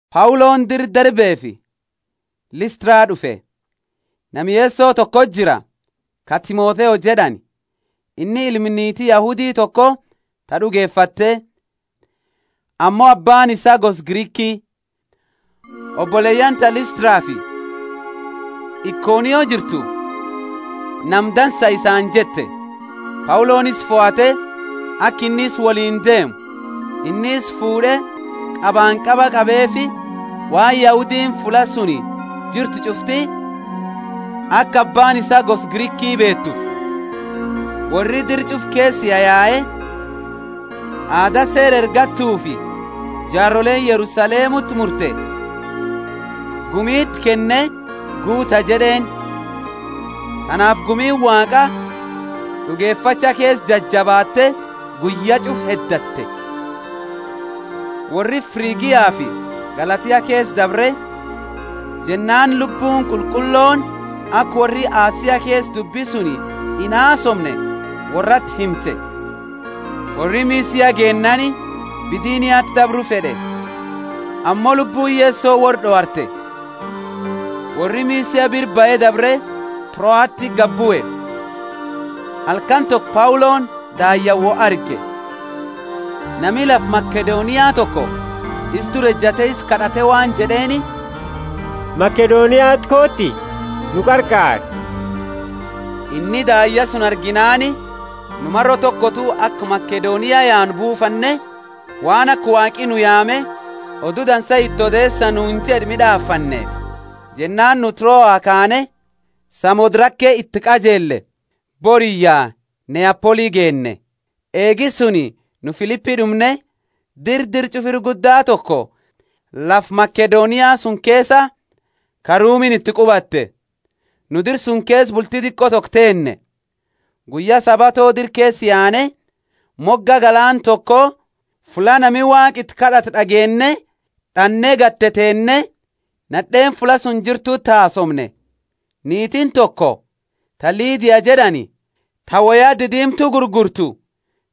Pauloni dira Derbefi Listra d'ufe. Nama Yeso tokoti jira, ka Timotheo jed'ani: inni ilma niiti Yahudi toko ta d'ugefatte, ammo abbaani isaa gosa Griki. Oboleyaani ta Listrafi Ikonio jirtu, Nama dansa isaani jette. Pauloni isa fohate, aka inni isa woliini deemu. Inni isa fuud'e qabanqaba qabeefi, waan Yahudiini fulla suni jirtu ch'ufti aka abbaani isaa gosa Griki beetuufi. Worri dira ch'ufa keesa yayae aada seera ergattufi jaaroleeni Yerusalemuti murte, gumi iti kenne, Guuta jed'eeni. Tanaafi gumiini Waaqa d'ugefacha keesa jajabaatte guyya ch'ufa heddatte. Worri Frigiafi Galatia keesa dabre, jennaani Lubbuuni Qulqullooni aka worri Asia keesa dubbi suni inhaasoomne worrati himte. Worri Misia geennaani Bithiniati dabru fed'e, ammo Lubbuuni Yeso worraa d'owarte. Worri Misia bira bahe dabre Troati gadibue. Halkani toko Pauloni daayyaani wo arge. Nami lafa Makedonia toko isa dura ejate isa kad'ate waan jed'eeni, Makedoniati kooti, nu qarqaari. Inni daayya suni arginaani, nu maro tokotu aka Makedonia yaanu buufanne, waan aka Waaqi nu yaame, Odu Dansa iti odeesa nuuni jed'e mid'aafanneefi. Jennaani nu Troa kaane, Samothrake iti qajeelle, boriyya Neapoli geenne. Eegi suni nu Filipi d'umne, dira dira ch'ufa ira gudda toko lafa Makedonia suni keesa, ka Rumiini iti qubatte. Nu dira suni keesa bulti diqo toko teenne. Guyya Sabato dira keesa yaane, moga galaana toko, fulla nami Waaqa iti kad'atu d'ageenne d'anne gadi teteenne, nad'eeni fulla suni jirtuti hasoomne. Niitiini toko, ta Lidia jed'ani, ta woya didiimtu gurgurtu,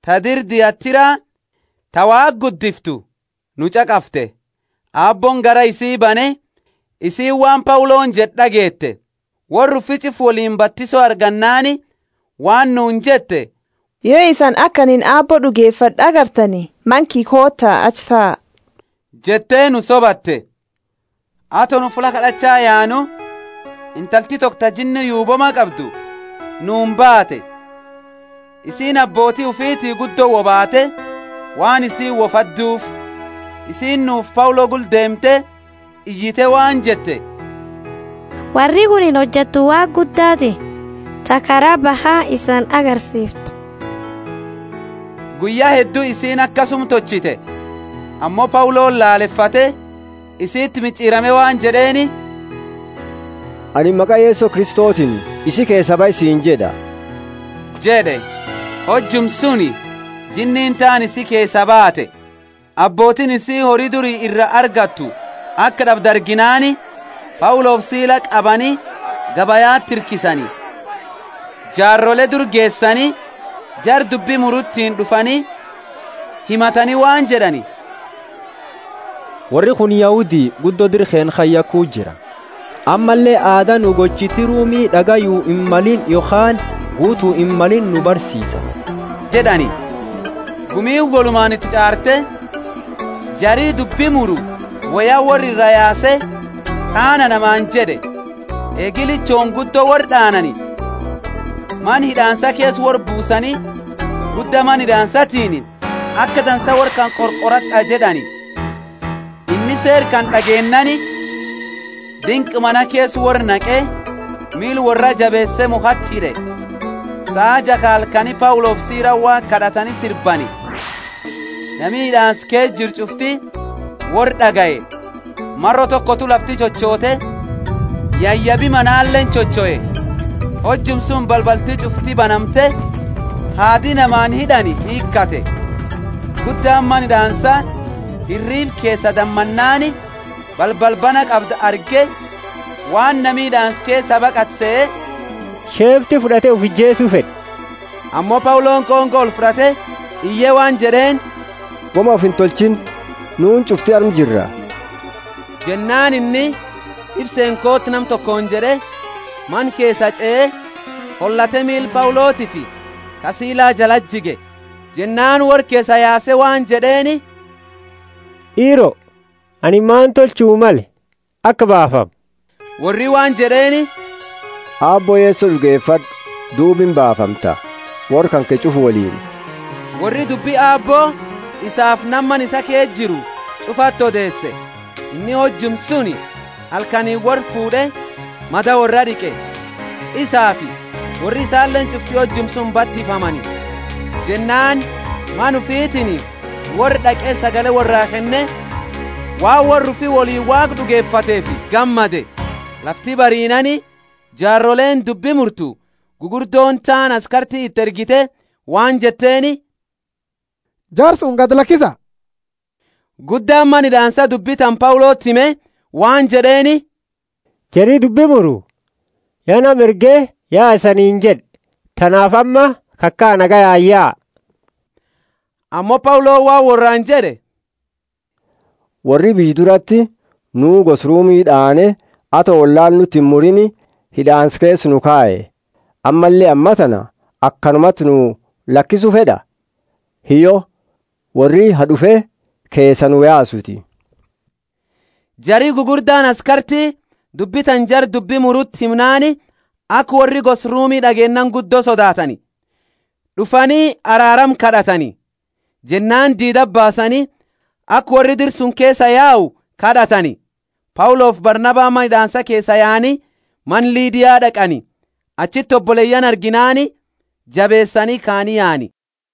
ta dira Thiatira, ta Waaqa guddiftu, nu ch'aqafte. Aabbooni garaa isi bane, isiini waan Pauloni jed'e d'ageete. Worra ufi ch'ufa woliini batiso argannaani waan nuuni jette yo isani aka anini Aabbo d'ugefad'e agartani, mana kiyya koota achi taa, jette nu sobate. Ato nu fulla kad'acha yaanu, intalti toko ta jinni yuubooma qabdu, nuuni baate. Isiini abbooti ufiti guddo wo baate, waan isiini wo fadduufi. Isiini nufi Paulo gula deemte iyite waan jette, Worri kunini hojattu Waaqa Guddaati, ta kara baha isani agarsiiftu. Guyya heddu isiini akasuma tolchite. Ammo Pauloni lalefate isiti mich'irame waan jed'eeni, Anini maqa Yeso Kristotiini, Isi keesaa bahi siini jed'a jed'e. Hojuma suni jinniini taani isi keesaa baate. Abbootiini isii hori duri ira argattu aka d'abdu arginaani Paulofi Sila qabani gabayati hirkisani, jaarole dura geesani, Jara dubbi murutini d'ufani himatani waan jed'ani, worri kunini Yahudi guddo dira keenna kana yakuu jira. Ammalle aada nu gochiti Rumi d'agayu himmalini yokhaani guutu himmalini nu barsiisa jed'ani. Gumiini wolumaani iti ch'aarte, jari dubbi muru woya worra iraa yaase, d'aana namaani jed'e. Eegi lichooni guddo worra d'aanani, mana hid'aansa keesa worra buusani, gudda mana hid'aansatiini, Aka dansa worra kana qorqorad'a jed'ani. Inni seera kana d'ageennaani dinqa mana keesa worra naqe, miila worraa jabeese mukhati hid'e. Saa jaa ka halkani Paulofi Silani Waaqa kad'atani sirbani, nami hid'aansa keesa jiru ch'ufti worra d'agaye. Maro tokotu lafti chochoote, yayabi manaleeni chochoe. Hojuma suni balbalti ch'ufti banamte, haadi namaani hid'ani hiikhate. Guddaani mana hid'aansa hiriiba keesa damannaani, balbala bana qabdu arge, waan nami hid'aansa keesaa baqate sehe, sheefti fud'ate ufi ijeesu fed'e. Ammo Pauloni qonqo olfud'ate iye waan jed'eeni, Woma ufi intolchiini, nuuni ch'ufti arma jira. Jennaani inni, Ifseeni kooti nama tokooni jed'e, mana keesa ch'ee, holate miila Paulotiifi ka Sila jalati jige. Jennaani worra keesaa yaase waan jed'eeni, D'iiro, anini mani tolchu male aka baafamu? Worri waan jed'eeni, Aabbo Yeso d'ugefad'u, duuba imbaafamta, worra kanke ch'ufa woliini. Worri dubbi Aabbo isaafi nama mana isaa keesa jiru ch'ufati odeese. Inni hojuma suni halkaniini worra fuud'e, mada worraa d'iqe. Isaafi worri isaleeni ch'ufti hojuma suni batifamani. Jennaani mana ufitiini worra d'aqe sagale worraa kenne waan worra ufi woliini Waaqa d'ugefateefi gammade. Lafti bariinaani, jaaroleeni dubbi murtu gugurdooni taani askarti iti ergite waan jetteeni, Jara suni gadi lakisa. Guddaani mana hid'aansa dubbi tana Pauloti hime waan jed'eeni, jari dubbi muru ya nama erge yaa isaniini jed'e, tanaafi amma kakaa nagayaani yaa. Ammo Pauloni waan worraani jed'e, Worri biyya durati, nuu gosa Rumi d'aane, ato wollaala nuti imurini hid'aansa keesa nu kaye! Ammalle ammatana akanumati nu lakisu fed'a? Hiyyo, worri ha d'ufe keesaa nu yaasuuti. Jari gugurdaani askarti dubbi tana jara dubbi muruti himnaani, aka worri gosa Rumi d'ageennaani guddo sodaatani, d'ufani araarama kad'atani. Jennaani diidati baasani, aka worri dira suni keesaa yau kad'atani. Paulofi Barnabani mana hid'aansa keesaa yaani mana Lidia d'aqani. Achiti oboleyaani arginaani jabeesani kaani yaani.